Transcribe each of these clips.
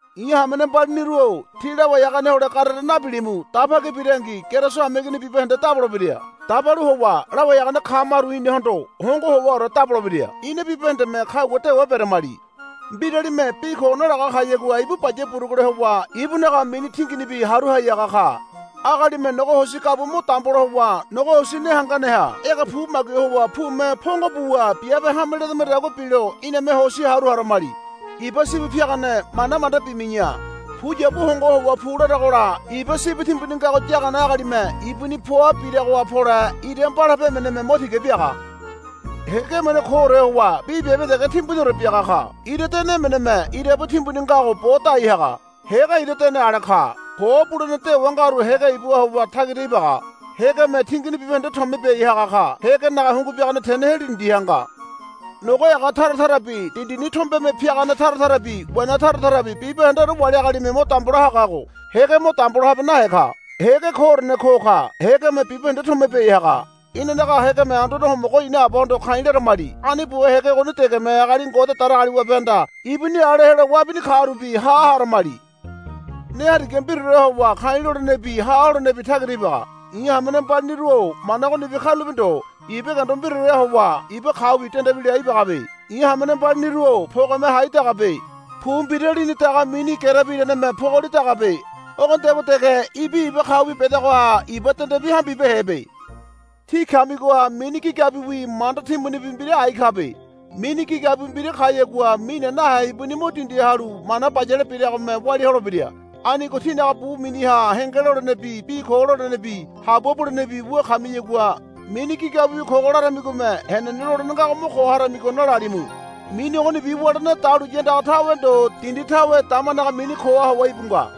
I̱ hamene mbaliniru-o tí lawai hagane hole garere nabilimu. Daba ki birangi Keriso hameigini bibahende dabolebira. Dabalu howa lawai hagane kamaru inahondo hongo howaore dabolebira. Ina bibahendeme kagua dewa beramali. Mbiralime bi ko nalaga kayagua ibu baya burugule howa ibunaga mini tinginibi haru hai haga ka. Agalime nogo hosi gabua mo dambola howa nogo hosi ne hanganeha ege pu magui howa pume pongo buwa biabe hame ledamadagua bilo iname hosi haru haramali. Iba sibi piagane mana manda bimi̱ya. Puyabu hongo howa pu laragola iba sibi timbuni ngago yagane agalime ibuni poa biragoha pole ira mbalape emeneme mo tiga biaga. Hége emene koore howa bi biabe dege timbuniore biaga ka. Ira dene emeneme irabu timbuni ngago bo dai haga. Hége ira dene ale ka. Ko bulene dewa ngaru hége ibuha howa tagira ibaga. Hégeme tingini bibahende tomia biai haga ka. Hégenaga hungu biagane tene heli dindiha nga. Nogo ega tara tarabi dindini tombene piagane tara tarabi wena tara tarabi bibahendeore wali agalime mo dambola hagago hége mo dambola habe nahe ka. Hége koorene ko ka. Hégeme bibahende tomia biai haga. Inanaga hégeme Anduane Homogo ina Abahondo ka̱i̱ laramali. Ani buwa hége ogoni degeme agali Ngode Datagaliwabehanda ibuni ale helo wabini karubi ha haramali. Ne hariga mbiraoreha howa ka̱i̱ lolenebi ha holenebi tagira ibaga. I̱ hamene mbaliniru-o mana ogonibi karulape ndo. Iba gendo mbiraoreha howa iba kaubi dendebila ibagabe. I̱ hamene mbaliniru-o pogeme hai dagabe. Pu mbira lini daga mini gerebi iraneme pogoli dagabe. Ogonidagua dege ibi iba kaubi bedagoha iba dendebi hambibehebe. Tí kamigoha mini gigabiwi manda timbunibi mbira ai kabe. Mini gigabiwi mbira kayagua mine nahe ibuni mo dindiha halu mana bayale biragome walia holebira. Anigo tínaga bu miniha henge lolenebi bi ko lolenebi habua bulenebi wu kamiyagua, Mini gigabiwi kogo, laramigome henene lolene ngago mo ko haramigo nalalimu. Mini ogonibi wulene dahuliya andaga tawe ndo dindi tawe damanaga mini koha howa íbu nga.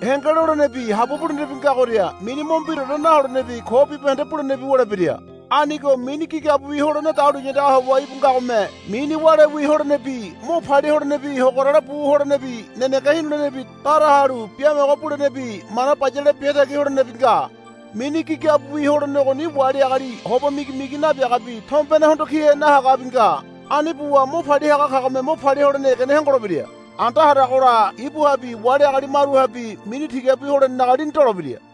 Henge lolenebi habua bulenebi ngagoria mini mo mbiraore naholenebi ko bibahende bulenebi wulebira. Anigo mini gigabiwi holene dahuliya andaga howa íbu ngagome mini wálewi holenebi mo palia holenebi hogorale bu holenebi nenege hinulenebi dara halu biamogo bulenebi mana bayale biatagi holenebi nga. Mini gigabiwi holene ogoni wali agali hoba migimigi nabiagabi tombene hondo kihe nahagabi nga. Ani buwa mo palia haga kagome mo palia holene egene hongolebira. Anda haragola ibuhabi wali agali maruhabi mini tigabi holenenaga lini dolebira.